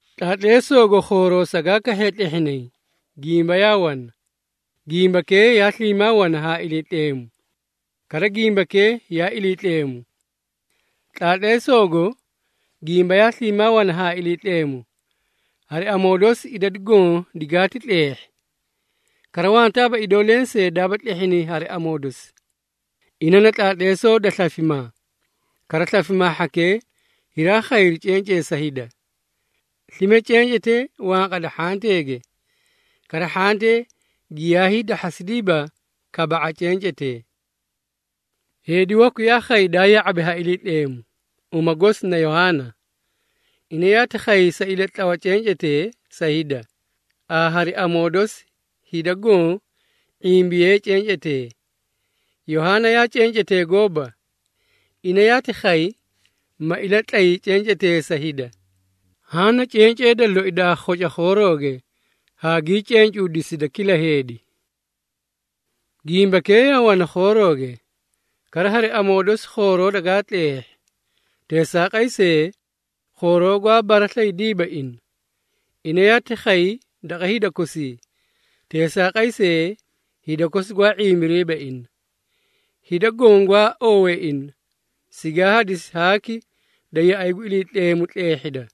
Tlaatleesoogo khooroo sagaa kahhiye tlehhinay, Gimba yaa wana. Gimbakee yaa sliimaa wana haa Iliitleemu. Kara, Gimbakee yaa Iliitleemu. Tlaatleesoogo Gimba yaa sliimaa wana haa Iliitleemu. Hari amoo dosi idadu goõ digaati tleehhi. Kara, wantaaba idoo lensee daaba tlehhinay hari amoo dosi. Ina na tlaatleesoo da slafimaa, kara slafimaa hhakee hiraa khayri cencee sa hida. Slime cencetee wanqada hhanteege, kara hhantee giyaa hiidahhasidiiba kaba⁄a cencetee. Heedi waku yaa khay daa ya⁄abi ha Iliitleemu, uma gosi na Yohaana. Ina yaati khay sa ilatlawa cencetee sa hida, haa hari amoo dosi hida goõ ⁄imbiyee cencetee. Yohaana yaa cencetee gooba. Ina yaati khay, ma ilatlay cencetee sa hida. Haã na cencee da loi daa khoca khoorooge haa gii cencuusida kila heedi. Gimbakee yaa wana khoorooge, kara hari amoo dosi khooroo dagaa tleehhi. Teesaaqay see, khooroo gwaa baraslaydiiba ina. Ina yaati khay daqa hida kosii, teesaaqay see, hida kosi gwaa ⁄imbiriiba ina. Hida goõ gwaa oowee ina, sigaa hadisi haaki da yaꞌay gu Iliitleemu tleehhida,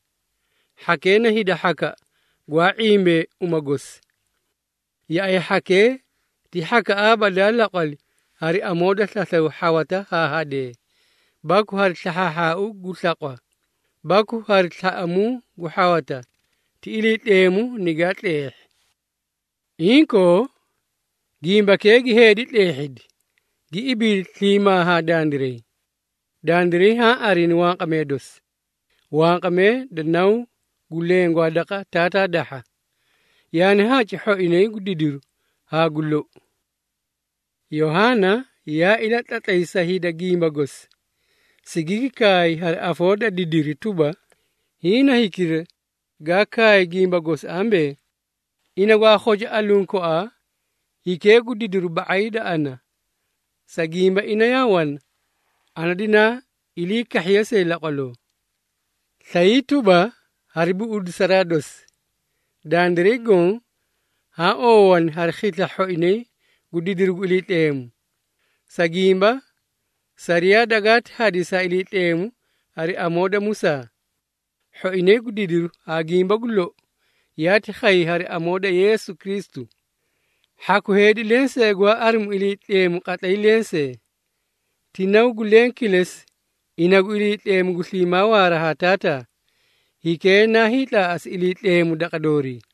hhakee na hida hhakaꞌa gwaa ⁄imbee uma gosi. Yaꞌay hhakee ti hhakaꞌaaba daa laqwali hari amoo da slaslaw hhawata haa hadee, baku hari slahhaahhaau gu slaqwa, baku hari slaꞌamuu gu hhawata, ti Iliitleemu nigaa tleehhi. Inkoo, Gimbakee gi heedi tleehhidi, gi ibiidi sliimaa haa dandiray. Dandiray haã arini wanqamee dosi, wanqamee da Naw gu leẽ gwaa daqa Taataa dahha, yaani haci hhoinay gu didiru haa gu lou. Yohaana yaa ilatlatlay sa hida gimba gosi, sigigi kaay hari afoo da didiri tuba, “Hiĩ na hikira gaa kaay gimba gosi ambee, ‘Ina gwaa khoca aluũ koaa hikee gu didiri ba⁄ay da ana, sa gimba ina yaa wana ana dinaa ilii kahhiye see laqwaloo.’” Slayii tuba hari buꞌudisaraa dosi, dandiray goõ haã oowani hari khisla hhoinay gu didiru gu Iliitleemu. Sa gimba, sariyaa dagaati hadisi ha Iliitleemu hari amoo da Musaa. Hhoinay gu didiru haa gimba gu lou, yaati khay hari amoo da Yeesu Kristu. Hhaku heedi lensee gwaa arimu Iliitleemu qatlay lensee. Ti Naw gu leẽ kilesi ina gu Iliitleemu gu sliimaa waara haa Taataa, hikee naa hiitlaaꞌasi Iliitleemu daqa doorii.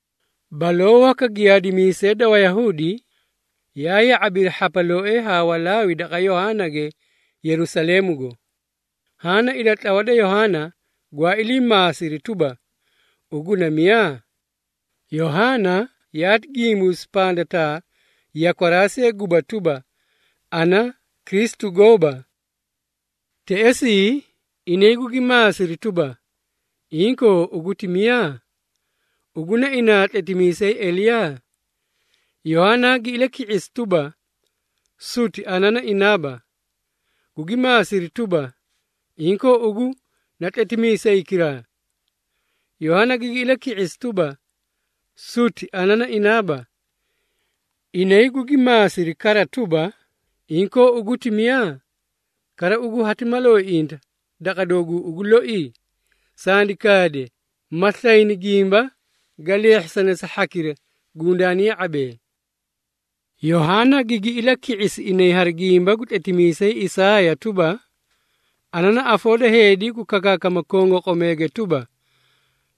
Baloo waka giyaadimiisee da Wayahuudi yaa ya⁄abiri hhapalooee haa Walaawi daqa Yohaanage, Yerusaleemugo. Haã na ilatlawa da Yohaana, gwaa ilii maasiri tuba, “Ugu na miyaa?” Yohaana yaati gimbuusi pandataa yakwaraa see guba tuba, “Ana Kristu gooba.” Teꞌesii, inay gugi maasiri tuba, “Inkoo, ugu ti miyaa? Ugu na inaa tletimiisay Eliyaa?” Yohaana gi ilaki⁄isi tuba, “Suti, ana na inaaba.” Gugi maasiri tuba, “Inkoo, ugu na tletimiisaykiraa?” Yohaana gigi ilaki⁄isi tuba, “Suti, ana na inaaba.” Inay gugi maasiri kara tuba, “Inkoo, ugu ti miyaa? Kara ugu hati mala oiiꞌinta daqa dooguu ugu loi? Sandi kaade, ma slayni gimba ga leehhisane sa hhakira gundaani ya⁄abee.” Yohaana gigi ilaki⁄isi inay hari gimba gu tletimiisay Isaaya tuba, “Ana na afoo da heedi gu kakaakama kongoqomeege tuba,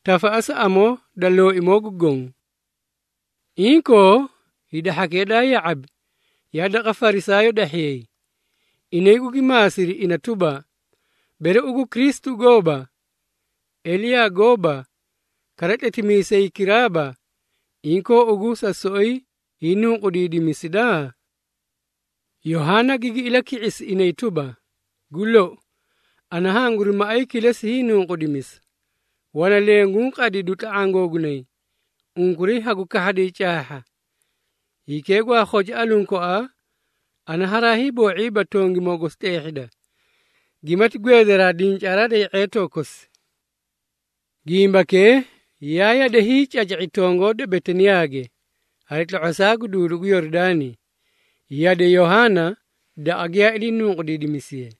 ‘Tafaꞌasa amoo da Looimoo gu Goõ.’” Inkoo, hida hhakee daa ya⁄abi, yaa daqa Farisaayoo dahhiyay. Inay gugi maasiri ina tuba, “Bere ugu Kristu gooba, Eliyaa gooba, kara tletimiisaykiraaba, inkoo ugu sa soꞌoyi hiinunqudiidimisida?” Yohaana gigi ilaki⁄isi inay tuba, “Gu lou, ana hanguri maꞌay kilesi hiinunqudimisa. Wana leẽ guũ qadidu tla⁄aã googunay, unkuray hagu kahhaday caahha. Hikee gwaa khoca aluũ koaa, ana haraa hiiboo⁄iiba tongimoo gosi tleehhida, gimati gweedaraa dincaaraa da ye⁄eetoo kosi.” Gimbakee yaa yade hiicaca⁄i tongoo da Betaniyaage, hari tlo⁄osaa gu duudu gu Yoridaani, yade Yohaana daqa giyaa ilii nunqudiidimisiye.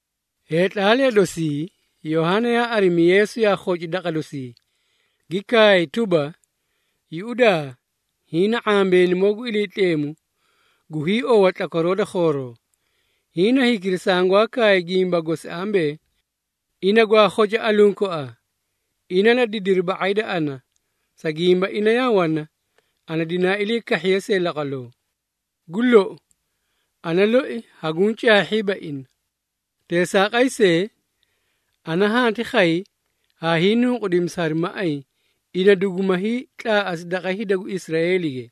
Heetlaalee dosii, Yohaana yaa arimi Yeesu yaa khoci daqa dosii, gi kaay tuba, “Yuꞌudaa! Hiĩ na ⁄ambeenimoo gu Iliitleemu gu hiiowa tlakwaroo da khooroo. Hiĩ na hikira sangwaa kaay gimba gosi ambee, ‘Ina gwaa khoca aluũ koaa, ina na didiri ba⁄ay da ana, sa gimba ina yaa wana ana dinaa ilii kahhiye see laqwaloo.’ Gu lou, ana loi haguũ caahhiiba ina. Teesaaqay see, ana hanti khay haa hiinunqudimisa hari maꞌay, ina duguma hiitlaaꞌasi daqa hida gu Israeelige.”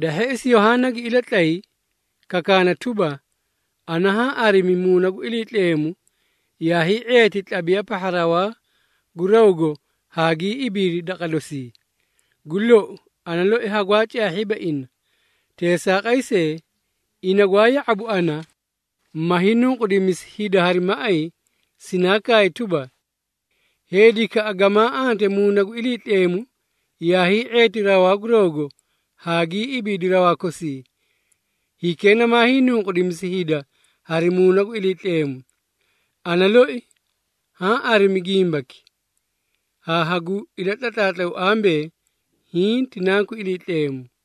Da hheꞌesi, Yohaana gi ilatlay, kakaana tuba, “Ana haã arimi Muuna gu Iliitleemu yaa hii⁄eeti tlabiya pahha rawaa gu rawgo haa gii ibiidi daqa dosii. Gu lou, ana loi hagwaa caahhiiba ina. Teesaaqay see, ina gwaa ya⁄abu ana, ma hiinunqudimisi hida hari maꞌay, sinaa kaay tuba, ‘Heedikaꞌa gamaa ante Muuna gu Iliitleemu yaa hii⁄eeti rawaa gu rawgo haa gii ibiidi rawaa kosii, hikee namaa hiinunqudimisi hida hari Muuna gu Iliitleemu.’ Ana loi haã arimi gimbaki, haa hagu ilatlatlaatlaw ambee, hiĩ ti Nanku Iliitleemu.”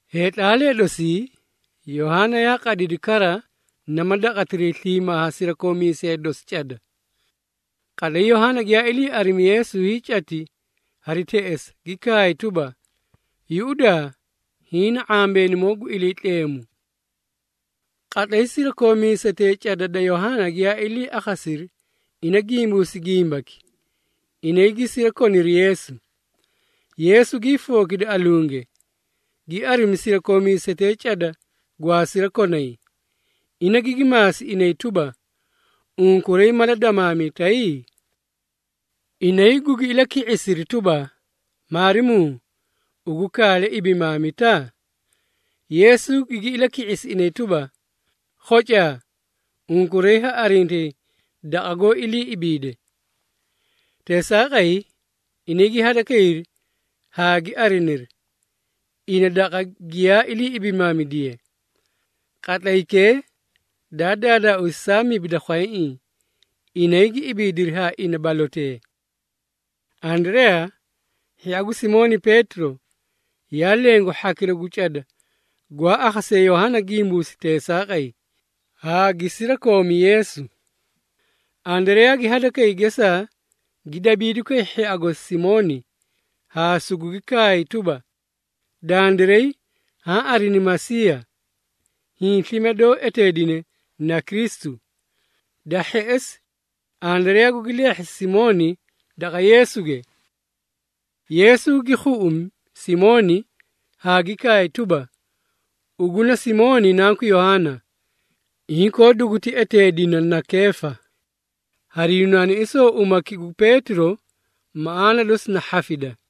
Heetlaalee dosii, Yohaana yaa qadidi kara nama daqatiray sliimaa haa sirakoomiisee dosi cada. Qatlay Yohaana giyaa ilii arimi Yeesu hiicati hari teꞌesa, gi kaay tuba, “Yuꞌudaa! Hiĩ na ⁄ambeenimoo gu Iliitleemu!” Qatlay sirakoomiisetee cada da Yohaana giyaa ilii akhasiri ina gimbuusi gimbaki, inay gi sirakoniri Yeesu. Yeesu gii fookidi alunge, gi arimi sirakoomiisetee cada gwaa sirakonay, ina gigi maasi inay tuba, “Unkuray mala damaamitay?” Inay gugi ilaki⁄isiri tuba, “Maarimuu, ugu kaale ibimaamita?” Yeesu gigi ilaki⁄isi inay tuba, “Khocaa, unkuray ha arintayi daqa goó ilii ibiide!” Teesaaqay, inay gi hadakayri haa gi ariniri, ina daqa giyaa ilii ibimaamidiye. Qatlaykee daa daadaauusi saa mibi da khwayaiĩ. Inay gi ibiidiri haa ina balotee. Andareyaa, hhia gu Simooni Peetiro, yaa leẽ gu hhakira gu cada gwaa akhasee Yohaana gimbuusi teesaaqay, haa gi sirakoomi Yeesu. Andareyaa gi hadakay gesaa gi dabiidukay hhia gosi Simooni haa sugugi kaay tuba, “Dandiray haã arini Masiiya.” Hiĩ slime doó eteedine na Kristu. Da hheꞌesi, Andareyaa gugi leehhisi Simooni daqa Yeesuge. Yeesu gi khuꞌumi Simooni haa gi kaay tuba, “Ugu na Simooni nanku Yohaana, inkoo duguti eteedina na Keefa.” Hari Yunaanaisoo umaki gu Peetiro, maꞌaana dosi na hhafida.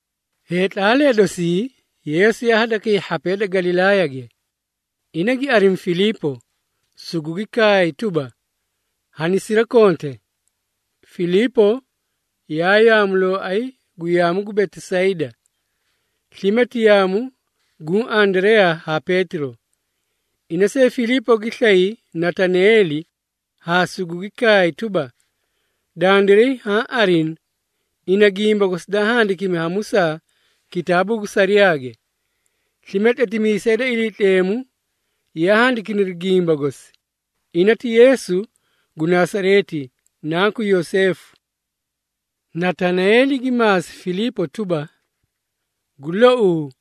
Heetlaalee dosii Yeesu yaa hadakay hhapee da Galilaayage. Ina gi arimi Filiipo, sugugi kaay tuba, “Hanisirakonte.” Filiipo yaa yaamulooay gu yaamu gu Betisayda, slime ti yaamu guũ Andareyaa haa Peetiro. Ina see Filiipo gi slay Natanaeeli haa sugugi kaay tuba, “Dandiray haã arini ina gimba gosi daa handakimi ha Musaa kitaabuu gu sariyaage, slime tletimiisee da Iliitleemu yaa handikiniri gimba gosi. Ina ti Yeesu gu Nasareeti, Nanku Yoseefu.” Natanaeeli gi maasi Filiipo tuba, “Gu louu,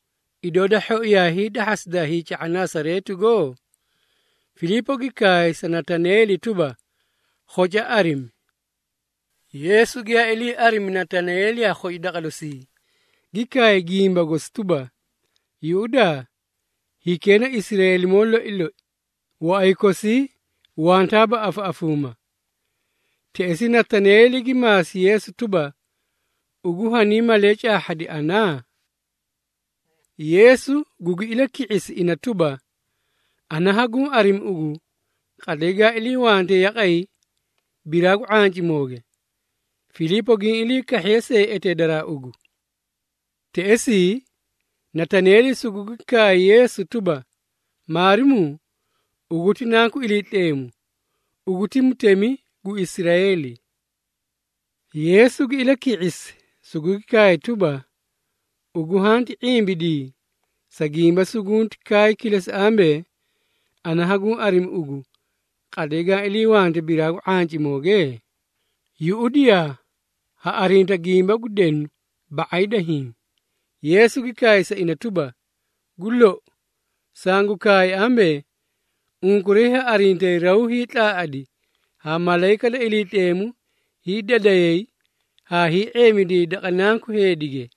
idoo da hhoi yaa hiidahhasida hiica⁄a Nasareetigo?” Filiipo gi kaay sa Natanaeeli tuba, “Khoca arimi.” Yeesu giyaa ilii arimi Natanaeeli yaa khoci daqa dosii, gi kaay gimba gosi tuba, “Yuꞌudaa! Hikee na Israeelimoo loi loi, waꞌay kosii wantaaba afaꞌafuuma.” Teꞌesii, Natanaeeli gi maasi Yeesu tuba, “Ugu haniĩ malee caahhadi ana?” Yeesu gugi ilaki⁄isi ina tuba, “Ana haguũ arimi ugu, qatlay gaã iliiwante yaqay biraa gu ⁄ancimooge, Filiipo giĩ ilii kahhiye see eteedaraa ugu.” Teꞌesii, Natanaeeli sugugi kaay Yeesu tuba, “Maarimuu, ugu ti Nanku Iliitleemu! Ugu ti Mutemi gu Israeeli!” Yeesu gi ilaki⁄isi, sugugi kaay tuba, “Ugu hanti ⁄imbidii, sa gimba sugunti kaay kilesi ambee, ana haguũ arimi ugu, qatlay gaã iliiwante biraa gu ⁄ancimooge? Yuꞌudiyaa, ha arinta gimba gu denu ba⁄ay da hiĩ.” Yeesu gi kaay sa ina tuba, “Gu lou, sangu kaay ambee, unkuray ha arintayi raw hiitlaaꞌadi haa malayika da Iliitleemu hiidadayay haa hii⁄eemidiyay daqa Nanku Heedige.”